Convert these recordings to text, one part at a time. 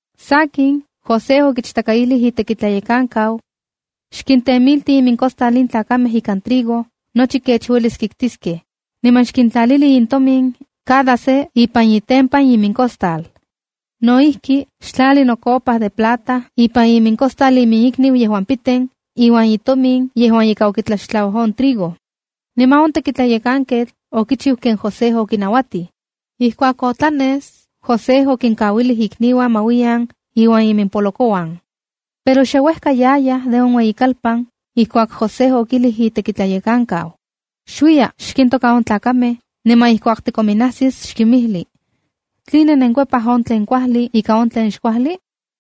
Sakin, José okichtakaijlij itekitlayekankau: —Xkintemilti imincostal in tlakamej ikan trigo nochi kech uelis kiktiskej, niman xkintlalili intomin cada se ipan itempan imincostal. No ijki, xtlali nocopa de plata ipan icostal inmikniu yejuan piten iuan itomin yejuan ika okitlaxtlau on trigo. Niman on tekitlayekanketl okichiu ken José okinauatij. Ijkuak otlanes, José okinkauilij ikniuan ma uiyan iuan iminpolokouan. Pero xe uejka yayaj de on ueyikalpan ijkuak José okijlij itekitlayekankau: —Xuiya xkintoka on tlakamej, niman ijkuak tikominnajsis xkinmijli: “¿Tline nenkikuepaj on tlen kuajli ika on tlen xkuajli?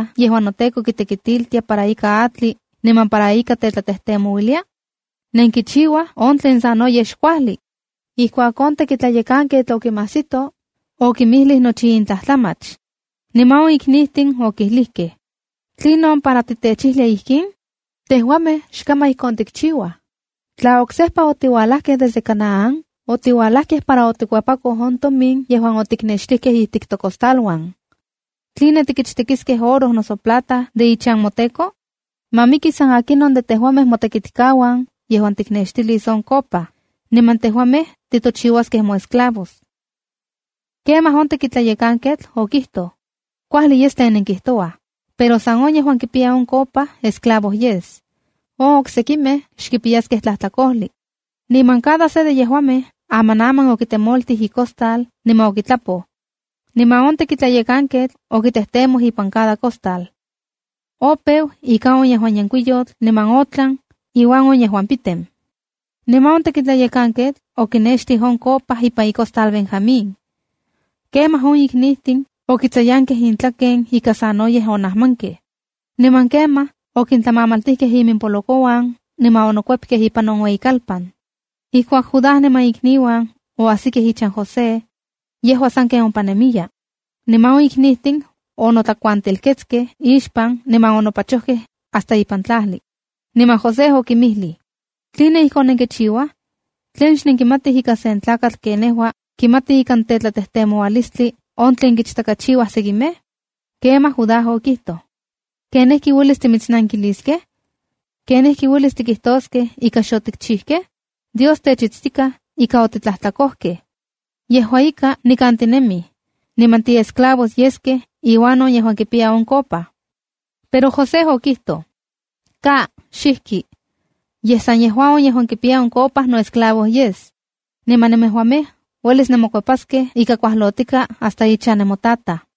yejuan noteko kitekitiltia para ika atli niman para ika tetlatejtemouilia? ¡Nenkichiua on tlen sanoyej xkuajli!” Ijkuak on tekitlayekanketl okinmajsito, okinmijlij nochi in tlajtlamach. Niman on iknijtin okilijkej: —¿Tlinon para titechijlia ijkin? ¡Tejuamej xkaman ijkon tikchiuaj! Tla oksejpa otiualajkej desde Canaán, otiuajlakej para otikuepakoj on tomin yejuan otiknextikej ijtik tocostaluan ¿Tline tikichtekiskej oro noso plata de ichan moteko? ¡Ma miki san akinon de tejuamej motekitkauan yejuan tiknextilis on copa, niman tejuamej titochiuaskej moesclavos! Kemaj on tekitlayekanketl okijtoj: —Kuajli yes tlen nenkijtouaj, pero san on yejuan kipiya on copa esclavo yes. On sekimej xkipiyaskej tlajtlakojli. Niman cada se de yejuamej amanaman okitemoltij icostal niman okitlapoj. Niman on tekitlayekanketl okitejtemoj ipan cada costal. Opeu ika on yejuan yenkuiyotl niman otlan iuan on yejuan piten. Niman on tekitlayekanketl okinextij on copa ipan icostal Benjamín. Kemaj on iknijtin okitsayankej intlaken ika sanoyej onajmankej. Niman kemaj okintlamamaltijkej iminpolokouan niman onokuepkej ipan on ueyikalpan. Ijkuak Judá niman ikniuan oajsikej ichan José, yejua sanken ompa nemiya. Niman on iknijtin onotlakuantelketskej ixpan, niman onopachokej hasta ipan tlajli, niman José okinmijlij: —¿Tline ijkon nenkichiuaj? ¿Tlen xnenkimatij ika sen tlakatl ken nejua kimati ikan tlatejtemoualistli on tlen kichtakachiuaj sekimej? Kemaj Judá okijtoj: —¿Ken ijki uelis timitsnankiliskej? ¿Ken ijki uelis tikijtoskej ika xotikchijkej? Dios techitstikaj ika otitlajtlakojtokej. Yejua ika, nikan tinemij, niman timoesclavos yeskej iuan on yejuan kipiya on copa. Pero José okijtoj: —Ka, xijki. Yej san yejua on yejuan kipiya on copa noesclavo yes. Niman nemejuamej uelis nenmokuepaskej ika kuajlotikaa hasta ichan nemotataj.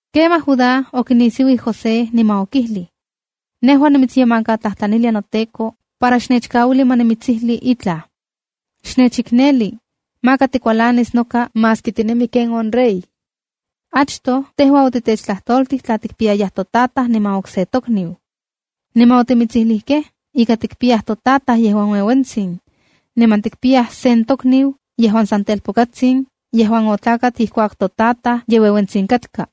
Kemaj Judá okinisiuij José niman okijlij: —Nejua nimitsyemankatlajtlanilia noteko para xnechkauili nimitsijlis itlaj. Xnechikneli, maka tikualanis noka maski tinemi ken on rey. Achtoj tejua otitechtlajtoltij tla tikpiyayaj totataj niman de okse tokniu. Niman otimitsijlijkej ika tikpiyaj totataj yejuan ueuentsin, niman tikpiyaj sen tokniu yejuan san telpokatsin yejuan otlakat ijkuak totataj ye ueuentsitsin katka.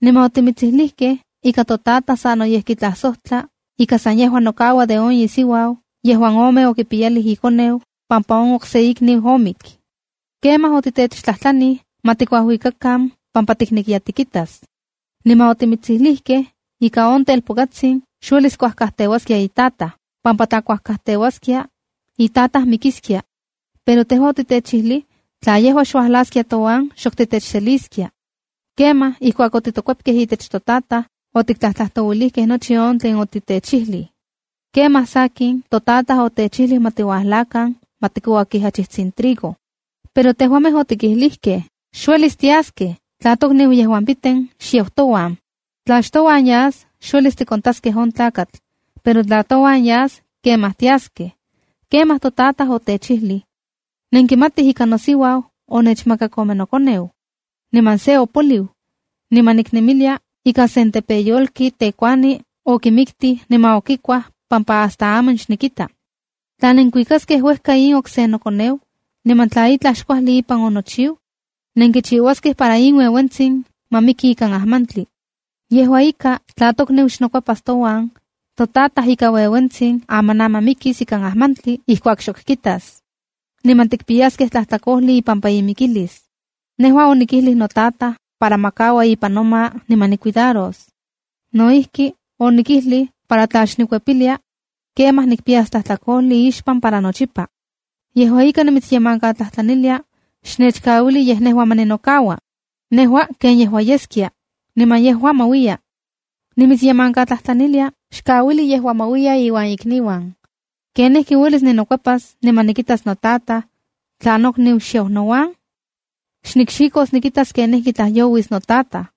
Niman otimitsijlijkej ika totataj sanoyej kitlajsojtla ika sa yejua nokaua de on isiuau yejuan ome okipiyalij ikoneu, pampa on okse ikniu omik. Kemaj otitechtlajtlanij ma tikuajuikakan pampa tiknekiya tikitas. Niman otimitsijlijkej ika on telpokatsin xuelis kuajkajteuaskia itataj, pampa tla kajteuaskia, itataj mikiskia. Pero tejua otitechijlij tla yejua xuajlaskia touan, xok titechseliskia. ’Kemaj ijkuak otitokuepkej itech totataj, otiktlajtlajtouilijkej nochi on tlen otitechijlij. Kemaj, sakin totataj otechijlij ma tiuajlakan ma tikouakij achijtsin trigo. Pero tejuamej otikijlijkej: ‘Xuelis tiuajlaskej tla tokniu yejuan piten xuajlau touan. Tla xtouan yas, xuelis tikontaskej on tlakatl, pero tla touan yas, kemaj tiaskej.’ Kemaj totataj otechijlij: ‘Nenkimatij ika nosiuau onechmakak ome nokoneu. Niman se opoliu, niman niknemilia ika sen tepeyolki tekuani okimiktij niman okikuaj pampa hasta aman xnikita. Tla nenkuikaskej uejka in okse nokoneu, niman tla itlaj xkuajli ipan onochiu, nenkichiuaskej para in ueuentzin ma miki ikan ajmantli.’ ’Yejua ika, tla tokniu xnokuepas touan, totataj ika ueuentsin amanaman mikis ika ajmantli ijkuak xok kitas. Niman tikpiyaskej tlajtlakojli ipampa imikilis. Nejua onikijlij notataj para ma kaua ipan noma niman nicuidaros. No ijki, onikijlij para tla xnikuepilia, kemaj nikpiyas tlajtlakojli ixpan para nochipa. Yejua ika, nimitsyemankatlajtlanilia, xnechkauili yej nejua ma ninokaua, nejua ken yejua yeskia, niman yejua ma uiya. Nimitsyemankatlajtlanilia xkauili yejua ma uiya iuan ikniuan. ¿Ken ijki uelis ninokuepas niman nikitas notataj, tla nokniu xyau nouan? ¡Xnikxikos nikitas kenijkitlajyouis notataj!”